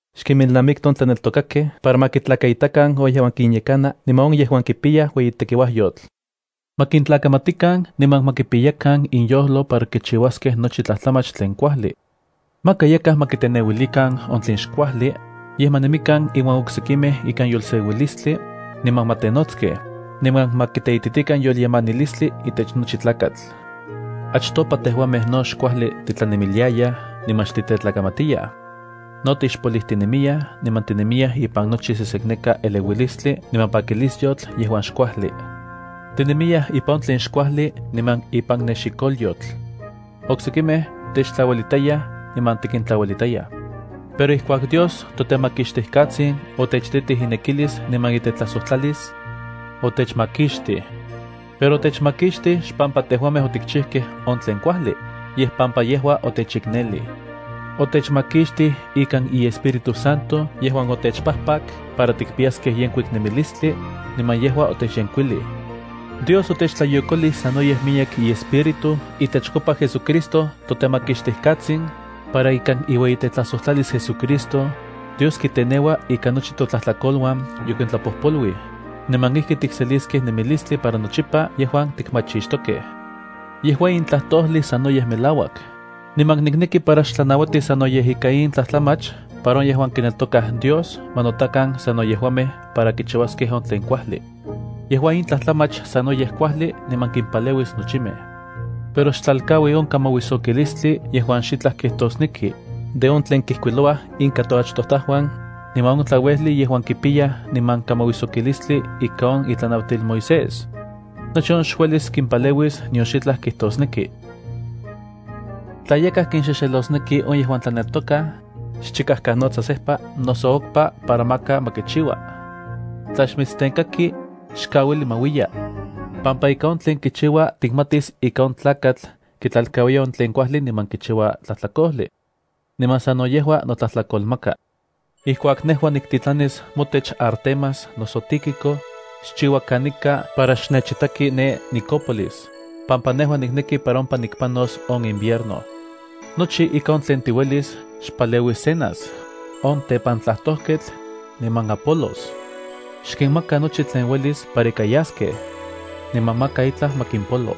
Xkinmelnamikti on tlaneltokakej para ma kintlakaitakan on yejuan tlayekanaj niman on yejuan kipiyaj ueyitekiuayotl. Ma kintlakamatikan niman ma kipiyakan inyojlo para kichiuaskej nochi tlajtlamach tlen kuajli. Maka yakaj ma kiteneuilikan on tlen xkuajli, yej ma nemikan inuan oksekimej ikan yolseuilistli, niman ma tenotskej, niman ma kiteititikan yolyemanilistli itech nochi tlakatl. Achtopa tejuamej no xkuajli titlanemiliayaj niman xtitetlakamatiyaj. No tixpolijtinemiyaj niman tinemiyaj ipan nochi sesekneka eleuilistli niman pakilisyotl yejuan xkuajli. Tinemiyaj ipan on tlen xkuajli niman ipan nexikolyotl. Oksekimej techtlauelitayaj niman tikintlauelitayaj. Pero ijkuak Dios toTemakixtijkatsin otechititij inekilis niman itetlajsojtlalis, otechmakixtij. Pero otechmakixtij xpampa tejuamej otikchijkej on tlen kuajli, yej pampa yejua otechiknelij. Otechmakixtij ikan iEspíritu Santo yejuan otechpajpak para tikpiyaskej yenkuik nemilistli, niman yejua otechyenkuilij. Dios otechtlayokolij sanoyej miyek iEspíritu itechkopa JesuCristo toTemakixtijkatsin, para ikan iueyitetlajsojtlalis JesuCristo, Dios kiteneua ika nochi totlajtlakoluan yokintlapojpoluij, niman ijki tikseliskej nemilistli para nochipa yejuan tikmachixtokej. Yejua in tlajtojli sanoyej melauak, niman nikneki para xtlanauati sanoyej ika in tlajtlamach para on yejuan kineltokaj Dios ma notakan sano yejuamej para kichiuaskej on tlen kuajli. Yejua in tlajtlamach sanoyej kuajli niman kimpaleuis nochimej. Pero xtlalkaui on kamauijsokilistli yejuan xitlaj kijtosnekij, de on tlen kijkuilouaj inka toachtojtajuan, niman on tlauejli yejuan kipiyaj niman kamauijsokilistli ika on itlanauatil Moisés. Nochi on xuelis kimpaleuis nion xitlaj kijtosneki. Tla yakaj kinxexelosneki on yejuan tlaneltokaj, xchikajkanotsa sejpa noso okpa para maka ma kichiua. Tla xmitstenkaki, xkauili ma uiya, pampa ika on tlen kichiua tikmatis ika on tlakatl kitlalkauiya on tlen kuajli niman kichiua tlajtlakojli. Niman sano yejua notlajtlakolmaka. Ijkuak nejua niktitlanis motech Artemas noso Tíquico, xchiua kanika para xnechitaki ne Nikópolis, pampa nejua nikneki para ompa nikpanos on invierno. Nochi ika on tlen tiuelis xpaleui Zenas, on tepantlajtojketl, niman Apolos. Xkinmaka nochi tlen uelis para ika yaskej, niman maka itlaj ma kimpolo.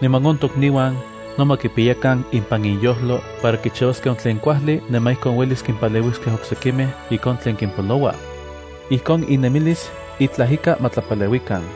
Niman on tokniuan no ma kipiyakan impan inyojlo para kichiuaskej on tlen kuajli niman ijkon uelis kimpaleuiskej oksekimej ika on tlen kimpoloua. Ijkon innemilis itlaj ika ma tlapaleuikan.